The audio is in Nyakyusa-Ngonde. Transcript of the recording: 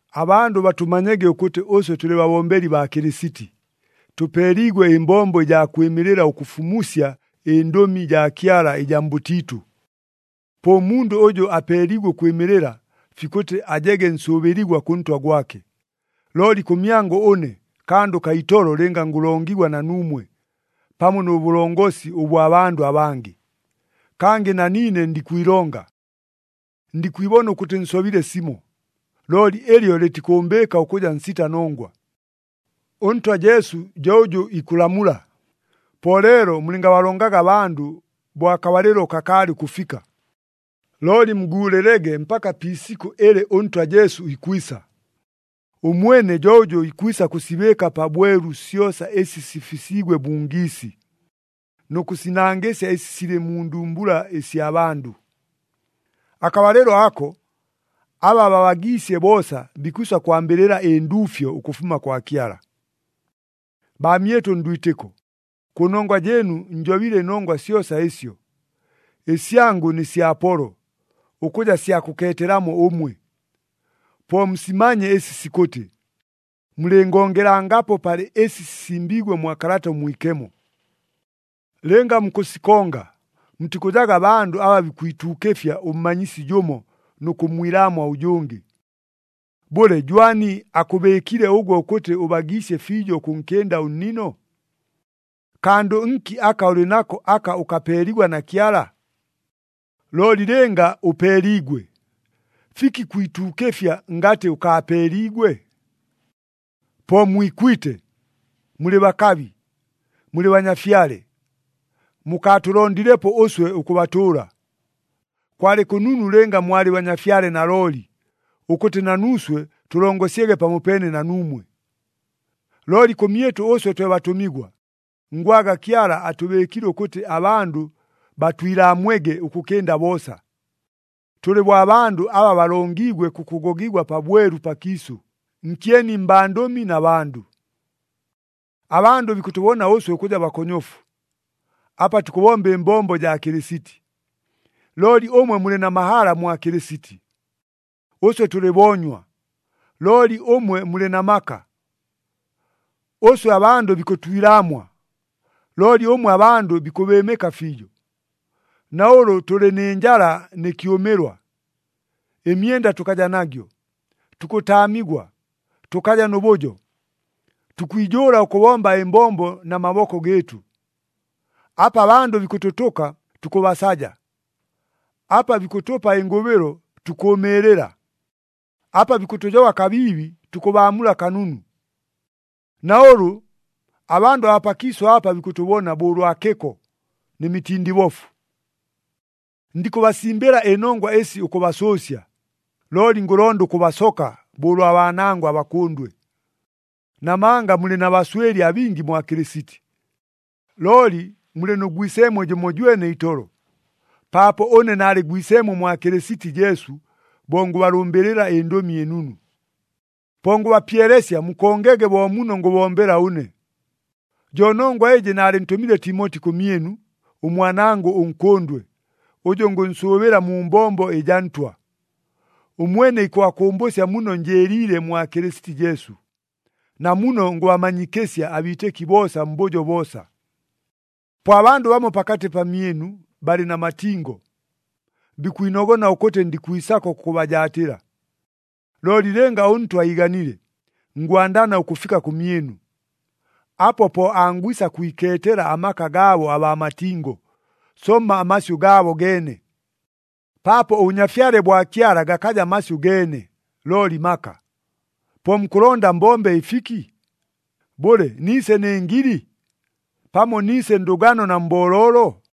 Abandʉ batʉmanyege ʉkʉtɨ ʉswe tʉlɨ babombeli baa Kɨlɨsiti, tʉpeeliigwe ɨmbombo ɨjaa kwɨmɨlɨla ʉkʉfumusya ɨndʉmi jaa Kyala ɨjaa mbʉtiitʉ. Po ʉmundʉ ʉjʉ apeeliigwe ʉkwɨmɨlɨla, fikʉtɨ ajege nsʉʉbɨligwa kʉ ntwa gwake. Looli kʉmyangʉ ʉne, kandʉ kaa itolo lɨnga ngʉlongigwa na nuumwe, pamo nʉ bʉlongosi ʉbwa bandʉ abangɨ. Kangɨ na niine ndikwilonga. Ndikwibona ʉkʉtɨ nsobile simo, looli ɨlyo lɨtikʉʉmbɨɨka ʉkʉja nsita nongwa. ɄNtwa Jesu jo ʉjʉ ikʉlamula. Po leelo mulɨngabalongaga abandʉ bo akabalɨlo kakaalɨ ʉkʉfika, looli muguulɨlege mpaka pi isikʉ ɨlɨ ʉNtwa Jesu ikwisa. Ʉmwene jo ʉjʉ ikwisa kʉsibɨɨka pabwelu syosa ɨsi sifisiigwe mu ngiisi, nʉ kʉsinangɨsya ɨsi silɨ mu ndumbula ɨsya bandʉ. Akabalɨlo ako, aba babagiisye boosa bikwisa kwambɨlɨla ɨnduufyo ʉkʉfuma kwa Kyala. Baamyɨtʉ ndwitɨko, kʉnongwa jɨɨnu njobile ɨnongwa syosa ɨsyo, ɨsyangʉ nɨ sya Apolo, ʉkʉja sya kʉkeetelamo ʉmwe. Po musimanye ɨsi sikʉtɨ, “Mulɨngongelangapo palɨ ɨsi sisimbiigwe mwa Kalata ʉMwikemo.” Lɨnga mukʉsikonga, mutikʉjaga bandʉ aba bikwituukɨfya ʉmmanyisi jʉmo nʉ kʉmmwilaamwa ʉjʉngɨ. Bʉle, jwani akʉbɨɨkile ʉgwe ʉkʉtɨ ʉbagiisye fiijo ʉkʉnkɨnda ʉnnino? Kandʉ nki aka ʉlɨ nako aka ʉkapeeligwa na Kyala? Looli lɨnga ʉpeeliigwe, fiki kwituukɨfya ngatɨ ʉkaapeeliigwe? Po mwikwite! Mulɨ bakabi! Mulɨ banyafyale! Mukaatʉlondilepo ʉswe ʉkʉbatʉʉla! Kwalɨ kʉnunu lɨnga mwalɨ banyafyale nalooli, ʉkʉtɨ na nuuswe tʉlongosyege pamopeene na nuumwe! Looli kʉmyɨtʉ ʉswe twe batʉmigwa, ngwaga Kyala atʉbɨɨkile ʉkʉtɨ abandʉ batwilaamwege ʉkʉkɨnda boosa. Tʉlɨ bo abandʉ aba balongiigwe kʉkʉgogigwa pabwelu pakiisʉ, nkyeni mbandʉmi na bandʉ. Abandʉ bikʉtʉbona ʉswe ʉkʉja bakonyofu, apa tukʉbomba ɨmbombo jaa Kɨlɨsiti. Looli ʉmwe mulɨ na mahala mwa Kɨlɨsiti! Ʉswe tʉlɨ boonywa, looli ʉmwe mulɨ na maka! Ʉswe abandʉ bikʉtwilaamwa, looli ʉmwe abandʉ bikʉbɨɨmɨka fiijo! Na ʉlʉ tʉlɨ nɨ njala nɨ kyʉmɨlwa, ɨmyenda tʉkaja nagyo, tukʉtaamigwa, tʉkaja nʉ bʉjo. Tukwijʉʉla ʉkʉbomba ɨmbombo na maboko gɨɨtʉ. Apa abandʉ bikʉtʉtʉka, tukʉbasaja, apa bikʉtʉpa ɨngʉbɨlo, tukʉʉmɨɨlɨla, apa bikʉtʉjoba kabiibi, tukʉbaamula kanunu. Na ʉlʉ, abandʉ abaa pakiisʉ apa bikʉtʉbona bo ʉlwa kɨko, nɨ mitindibofu. Ndikʉbasimbɨla ɨnongwa ɨsi ʉkʉbasʉʉsya, looli ngʉlonda ʉkʉbasoka bo ʉlwa baanangʉ abakʉndwe. Namanga mulɨ na baswɨli abingi mwa Kɨlɨsiti, looli mulɨ nʉ gwiseemwe jʉmojwene itolo, paapo ʉne naalɨ gwiseemwe mwa Kɨlɨsiti Jesu bo ngʉbalʉmbɨlɨla ɨNdʉmi ɨNunu. Po ngʉbapyelesya mukongege bo muno ngʉbombela ʉne. Jo nongwa ɨjɨ naalɨntʉmile Timoti kʉmyɨnu, ʉmwanangʉ ʉnkʉndwe, ʉjʉ ngʉnsʉʉbɨla mu mbombo ɨjaa Ntwa. Ʉmwene ikʉbakʉmbʉsya muno njɨɨliile mwa Kɨlɨsiti Jesu, na muno ngʉmanyikɨsya abiitɨki boosa mbʉjo boosa. Po abandʉ bamo pakatɨ pamyɨnu balɨ na matingo, bikwinogona ʉkʉtɨ ndikwisako kʉkʉbajaatɨla. Looli lɨnga ʉNtwa iiganile, ngwandana ʉkʉfika kʉmyɨnu. Apo po angwisa kwikeetela amaka gaabo abaa matingo, somma amasyʉ gaabo geene. Paapo ʉBʉnyafyale bwa Kyala gakaja masyʉ geene, looli maka. Po mukʉlonda mbombe ɨfiki? Bʉle, niise nɨ ngili? Pamo niise ndʉgano na mbooloolo?